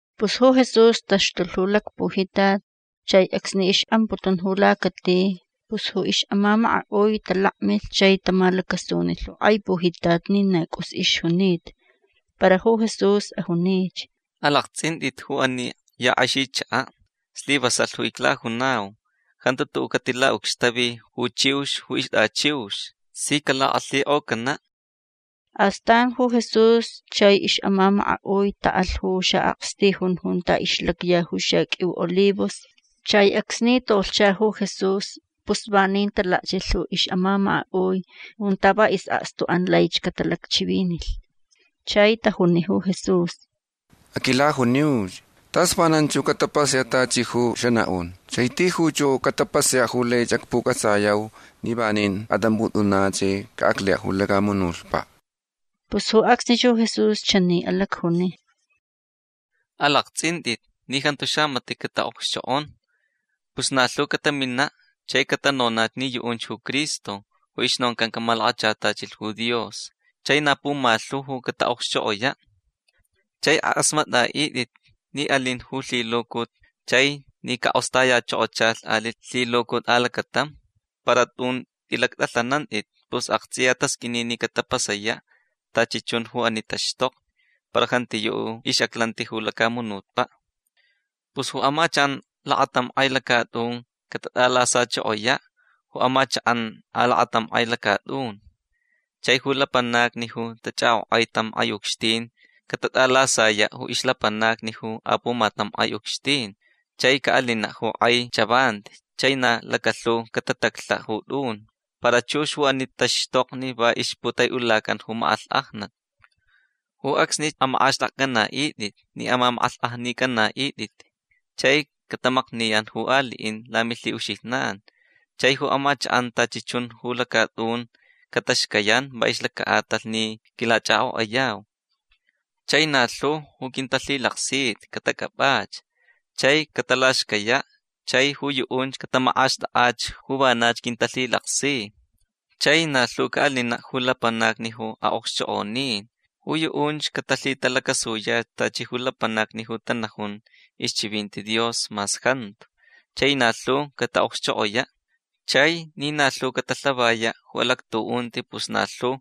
Pus ju Jesús taxtulh ju lacpujitat. Chai acsni ix'amputun ju lacati pus ju ix'amamaka'ui talakmilh chai tamalacasunilh ju k'ai pujitat ni na c'us ixjunita. Para ju Jesús ajunich: ―Alakts'int'it ju ani ya k'exi chaka'. Slivasalh ju iclajunau. Jantu tu'u' catila'ucxtavi ju chiux ju ixt'achiux. Si calak'alhik'ocana'. Astan ju Jesús chai ix'amamaka'ui ta'alh ju xa'akstijun junta ixlacya ju xaq'uiu olivos. Chai acsni tolhcha ju Jesús pus vanin talakchilh ju ix'amamaka'ui junta va is'akstu'an laich catalacchivinilh. Chai tajuni ju Jesús: ―Aquilajuniuch. Tas vananch ju catapasaya' tachi ju xana'un. Chai tijuch ju catapasaya' ju lai acpuc'atsayau ni vanin at'amp'ut'una' chai ca'aclaya' ju lacamunutpa'. Pus ju acsnich ju Jesús chani alacjuni: ―Alakts'int'it ni jantu xamati' cata'okxchok'on. Pus na lhu catamina' chai catanonach ni yu'unch ju Cristo ju ixnoncan camalakachatachilh ju Dios. Chai na pumalhu ju cata'okxchok'oya'. Chai ak'asmat'a'it'it ni alin ju lhilucut chai ni cak'ostayachokochalh ali' lhilucut alacatam. Para tun t'ilact'alhanant'it. Pus akts'iya tasq'uini ni catapasaya' tachi chun ju ani taxtokni. Para jantiyu' ju ix'aclanti ju lacamunutpa'. Pus ju amachak'an lakatam k'ai lacat'un cat'alasachokoya' ju amachak'an alakatam k'ai lacat'un. Chai ju lapanacni ju tach'ak'ok'ai tam k'ai ucxtin catat'alasaya' ju ixlapanacni ju apumatam k'ai ucxtin. Chai ca'alina' ju k'ai chavanti chai na lacalhu catataclha' ju t'un. Para chux ju ani taxtokni va ixputai'ulacan ju mak'alhk'ajnat. Ju acsnich amak'axt'akc'ana'it'it ni amamak'alhk'ajnic'ana'it'it. Chai catamakniyan ju ali'in lamilhi'uxijnan. Chai ju amachak'an tachi chun ju lacat'un cataxcayan va ixlaca'atalh ni quilach'ak'ok'ayau. Chai na lhu ju quintalhilaksita catac'ap'ach. Chai catalaxcaya'. Chai ju yu'unch catamak'axt'ak'ach ju vanach quintalhilaksi. Chai na lhu ca'alina' ju lapanacni ju a'okxchok'onin. Ju yu'unch catalhitalacasuyach tachi ju lapanacni ju tanajun ixchivinti Dios mas jantu. Chai na lhu cata'okxchok'oya'. Chai ni na lhu catalhavaya' ju alactu'unti pus na lhu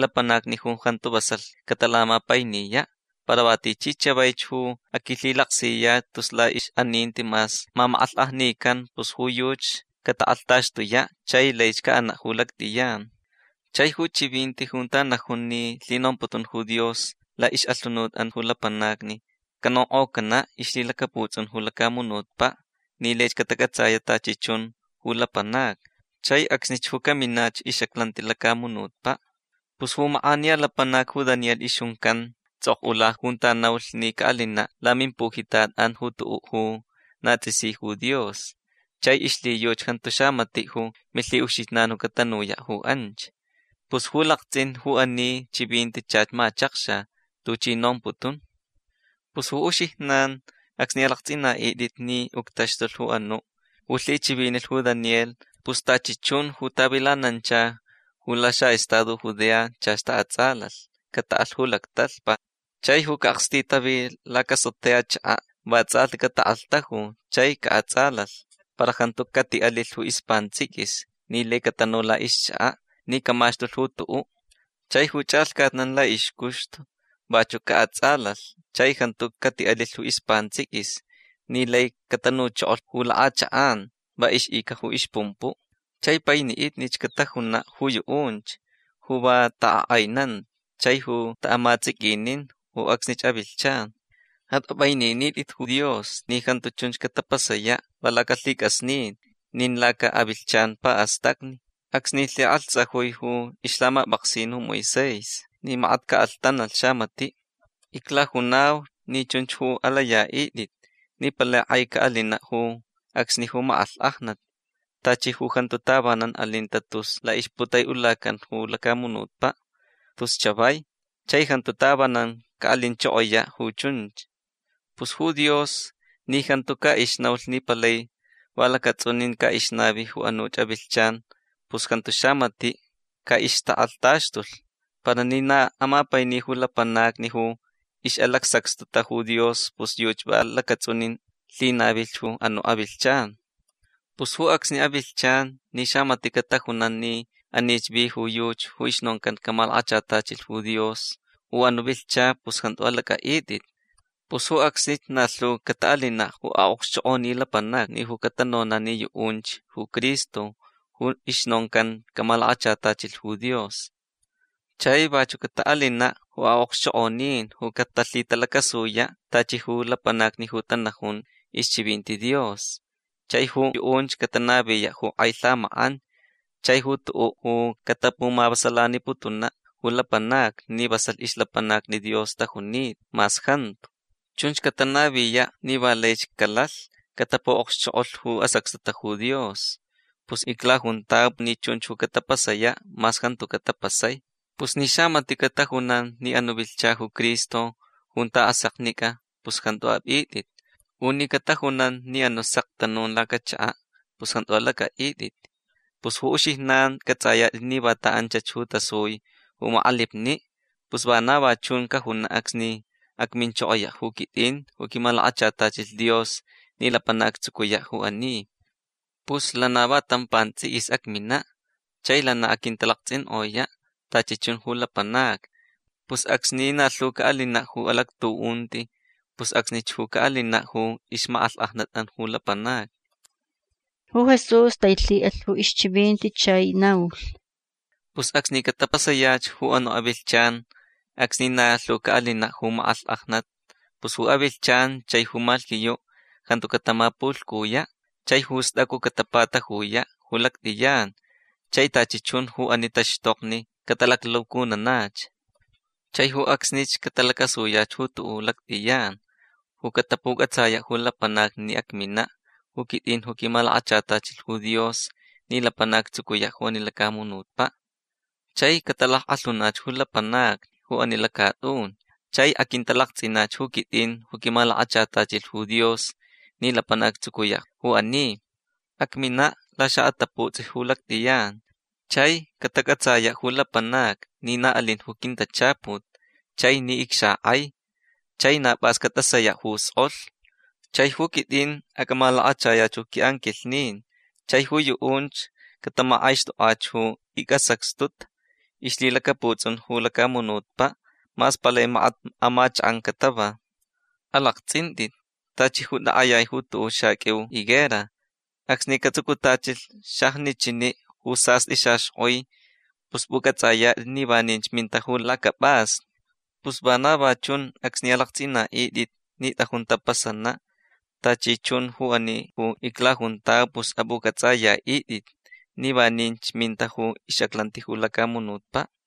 lapanacni jantu vasalh catalamapainiya'. Para va tichi chavaich ju aquilhilaksiyach tus la'ix'aninti mas mamak'alhk'ajnican pus ju yuchi catak'alhtaxtuya' chai laich ca'ana' ju lact'iyan. Chai ju chivinti junta najun ni lhinomputun ju Dios la'ix'alhunut'an ju lapanacni canonk'ocana' ixlhilacaputs'un ju lacamunutpa' ni laich catac'atsaya' tachi chun ju lapanacni. Chai acsnich ju caminach ix'aclanti ju lacamunutpa'. Pus ju mak'aniya lapanac ju Daniel ixjuncan ts'ok'ula junta naulh ni ca'alina' lamimpujitat'an ju tu'u' ju na ts'isi ju Dios. Chai ixlhiyuchi jantu xamati' ju milhi'uxijnan catanuya' ju anch. Pus ju lakts'in ju ani chivinti chach machakxa tuchi nomputun. Pus ju uxijnan acsni alakts'ina'it'it ni uctaxtulh ju anu' ju lhichivinilh ju Daniel pus tachi chun ju tavilanancha ju laxa'estado Judea chach ta'ats'alalh. Cata'alh ju lactalhpa. Chai ju ca'akstitavi lacasotea chaka' va ts'alhti catak'alhtaju chai ca'ats'alalh. Para jantu cati'alilh ju ispants'iquis ni lai catanu la'ixchaka' ni camaxtulh ju tu'u'. Chai ju ch'alhcatnan la'ixcuxtu vachu' ca'ats'alalh chai jantu cati'alilh ju ispants'iquis ni lai catanuchokolh ju lak'achak'an va ix'ica ju ixpumpu'. Chai paini'itnich catajuna' ju yu'unch ju va tak'ak'ainanta chai ju ta'amats'iquinin ju acsnich avilhchan. At'ap'aininit'it ju Dios ni jantu chunch catapasaya' va lacalhic'asnin nin laca'avilhchan pa'astacni acsni lhik'alhtsajui ju ixlhamap'aksin ju Moisés ni makat ca'alhtanalh xamati'. Iclajunau ni chunch ju alaya'it'it ni palai k'ai ca'alina' ju acsni ju mak'alhk'ajnat tachi ju jantu tavanan alinta tus la'ixputai'ulacan ju lacamunutpa' tus chavai. Chai jantu tavanan ca'alinchokoya' ju chunch. Pus ju Dios ni jantu ca'ixnaulh ni palai va lacats'unin ca'ixnavi ju anuch avilhchan pus jantu xamati' ca'ixtak'alhtaxtulh. Para ni na amapaini ju lapanacni ju ix'alacsacxtuta ju Dios pus yuchi va lacats'unin lhinavilh ju anu' avilhchan. Pus ju acsni avilhchan ni xamati' catajunan ni anich vi ju yuchi ju ixnoncan camalakachatachilh ju Dios u anu' vilhcha pus jantu alac'a'it'it. Pus ju acsnich na lhu cata'alina' ju okxchok'oni lapanacni ju catanona' ni yu'unch ju Cristo ju ixnoncan camalakachatachilh ju Dios. Chai vachu' cata'alina' ju a'okxchok'onin ju catalhitalacasuya' tachi ju lapanacni ju tanajun ixchivinti Dios. Chai ju yu'unch catanaviya' ju k'ai lhamak'an chai ju tu'u' ju catapumavasalaniputuna' ju lapanacni ni vasalh ixlapanacni Dios tajunita mas jantu. Chunch catanaviya' ni va laich calalh catapu'okxchok'olh ju asacxtuta ju Dios. Pus iclajuntau ni chunch ju catapasaya' mas jantuca' tapasai. Pus ni xamati' catajunan ni anu' vilhcha ju Cristo junta aseknic'a pus jantu ap'it'it. U ni catajunan ni anu' sek tanun lacachaka' pus jantu alac'a'it'it. Pus ju uxijnan c'ats'ayat'it ni vanta anchach tasui ju mak'alipni'. Pus vana va chunch cajuna' acsni acminchokoya' ju quit'in ju quimalakachatachilh Dios ni lapanac actsucuya' ju ani. Pus lana va tam pants'iquis acmina' chai lana aquintalakts'ink'oya' tachi chun ju lapanacni. Pus acsni na lhu ca'alina' ju alactu'unti pus acsnich ju ca'alina' ju ixmak'alhk'ajnat'an ju lapanacni. Ju Jesús tailhi'alh ju ixchivinti chai naulh: ―Pus acsni catapasayach ju anu' avilhchan acsni na lhu ca'alina' ju mak'alhk'ajnat pus ju avilhchan chai ju malhquiyu' jantu catamapulhcuya' chai ju st'acu catapatajuya' ju lact'iyan. Chai tachi chun ju ani taxtokni catalaclucununach. Chai ju acsnich catalacasuyach ju tu'u' ju lact'iyan ju catapuc'atsaya' ju lapanacni ni acmina' ju quit'in ju quimalakachatachilh ju Dios ni lapanac actsucuya' ju ani lacamunutpa'. Chai catalack'alhunach ju lapanacni ju ani lacat'un. Chai aquintalakts'inach ju quit'in ju quimalakachatachilh ju Dios ni lapanac actsucuya' ju ani. Acmina' laxa'ataputs'i ju lact'iyan chai catac'atsaya' ju lapanacni ni na alin ju quintachaput chai ni icxak'ai. Chai na p'as cat'asaya' ju sk'olh. Chai ju quit'in acmalakachayach ju qui'anquilhnin chai ju yu'unch catamak'aixt'ok'ach ju icsacxtuta ixlhilacaputs'un ju lacamunutpa' mas palai makat amachak'an catava. Alakts'int'it tachi ju tak'ayai ju tu'u' xaq'uiu higuera. Acsni catsucutachilh xajnichini' ju sast'i xaxk'oi pus p'uc'ats'ayat'it ni vaninch minta ju lacap'asni. Pus vana va chun acsni alakts'ina'it'it ni t'ajun tapasana' tachi chun ju ani ju iclajuntau pus ap'uc'ats'aya'it'it ni vaninch minta ju ix'aclanti ju lacamunutpa'.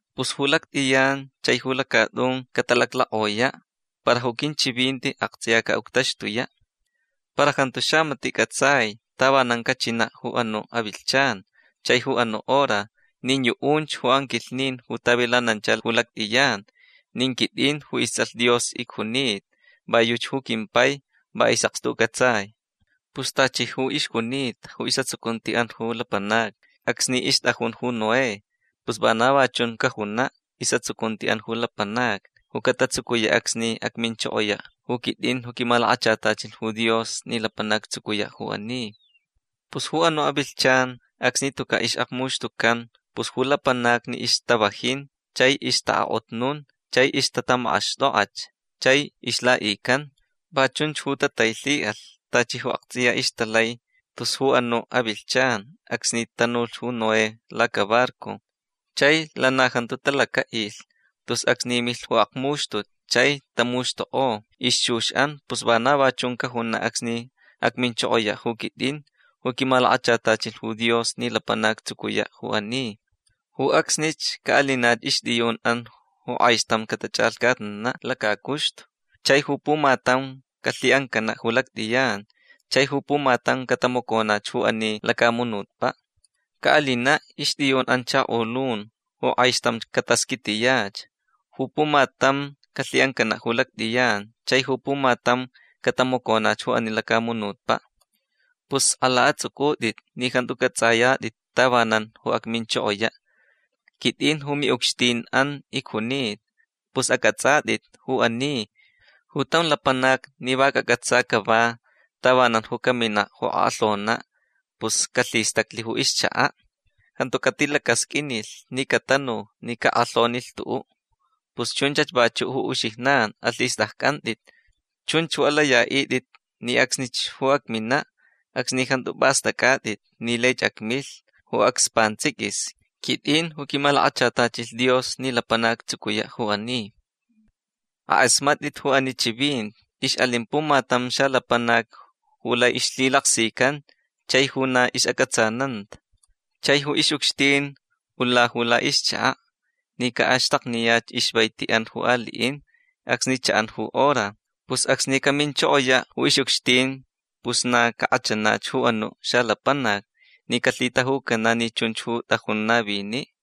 Pus ju lact'iyan chai ju lacat'un catalaclak'oya'. Para ju quinchivinti akts'iya ca'uctaxtuya'. Para jantu xamati' c'atsai tavanan cachina' ju anu' avilhchan chai ju anu' hora. Nin yu'unch ju anquilhnin ju tavilanancha ju lact'iyan nin quit'in ju ists'alh Dios icjunita. Va yuchi ju quimpai. Va is'akstu c'atsai. Pus tachi ju ixjunita ju is'atsucunti'an ju lapanacni acsni ixt'ajun ju Noé pus vana va chun ju cajuna' is'atsucunti'an ju lapanacni ju catatsucuya' acsni acminchokoya' ju quit'in ju quimalakachatachilh ju Dios ni lapanac actsucuya' ju ani. Pus ju anu' avilhchan acsni tuca' ix'akmuxtucan pus ju lapanacni ixtavajin chai ixta'ak'otnun chai ixtatamak'axt'ok'ach chai ixla'ican. Va chunch ju tatailhi'alh tachi ju akts'iya ixtalai tus ju anu' avilhchan acsni tanulh ju Noé lacabarco. Chai lana jantu talaca'ilh tus acsni milh ju akmuxtut chai tamuxtuk'o ixchux'an. Pus vana va chun cajuna' acsni acminchokoya' ju quit'in ju quimalakachatachilh ju Dios ni lapanac actsucuya' ju ani. Ju acsnich ca'alinach ixt'iyun'an ju k'aixtam catach'alhcatnana' lacacuxtu. Chai ju pumatam calhi'ancana' ju lact'iyan. Chai ju pumatam catamaconach ju ani lacamunutpa'. Ca'alina' ixt'iyun'an chakolun ju k'aixtam catasquitiyach. Ju pumatam calhi'ancana' ju lact'iyan. Chai ju pumatam catamaconach ju ani lacamunutpa'. Pus sk'ala ats'uc'ut'it ni jantu c'ats'ayat'it tavanan ju acminchokoya'. Quit'in ju mi'ucxtin'an icjunita. Pus ac'ats'at'it ju ani. Ju tam lapanac ni va cac'atsa cava tavanan ju camina' ju ak'alhona' pus calhistaclh ju ixchaka'. Jantu catilacasq'uinilh ni catanu ni cak'alhaunilh tu'u'. Pus chunchach vachu' ju uxijnan. Alhist'acc'ant'it. Chunch ju alaya'it'it ni acsnich ju acmina' acsni jantu p'ast'ac'at'it ni laich acmilh ju acs pants'iquis. Quit'in ju quimalakachatachilh Dios ni lapanac actsucuya' ju ani. Ak'asmat'it ju ani chivinti. Ix'alin pumatam xalapanac ju lai ixlhilaksican chai ju na ix'ac'atsananta. Chai ju ix'ucxtin ula ju la'ixchaka' ni ca'axtakniyach ixvaiti'an ju ali'in acsni cha'an ju hora. Pus acsni caminchokoya' ju ix'ucxtin pus na cak'achanach ju anu' xalapanac ni calhitajucana' ni chunch ju t'ajun navini'.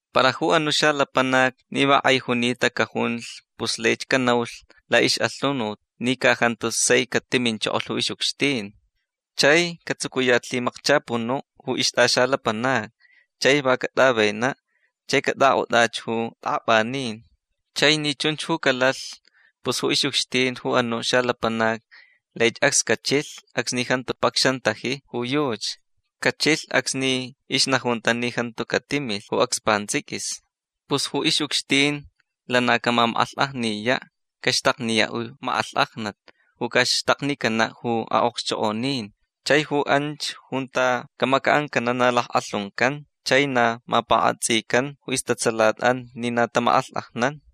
Para ju anu' xalapanac ni va k'ai junita cajunlh pus laich canaulh la'ix'alhunut ni ca jantu sai catiminchokolh ju ix'ucxtin. Chai catsucuyach lhimakchapunu' ju ixt'axalapanacni chai va cat'avena' chai cat'ak'ot'ach ju t'ak'ap'anin. Chai ni chunch ju calalh pus ju ix'ucxtin ju anu' xalapanac laich acs cachilh acsni jantu pacxantaji ju yuchi. Cachilh acsni ixnajunta ni jantu catimilh ju acs pants'iquis. Pus ju ix'ucxtin lana camamak'alhk'ajniya'. Caxtakniya' ju mak'alhk'ajnat ju ca'axtaknicana' ju a'okxchok'onin. Chai ju anch junta camaca'ancana' na lack'alhuncan chai na mapak'atsican ju istatsalat'an ni na tamak'alhk'ajnan.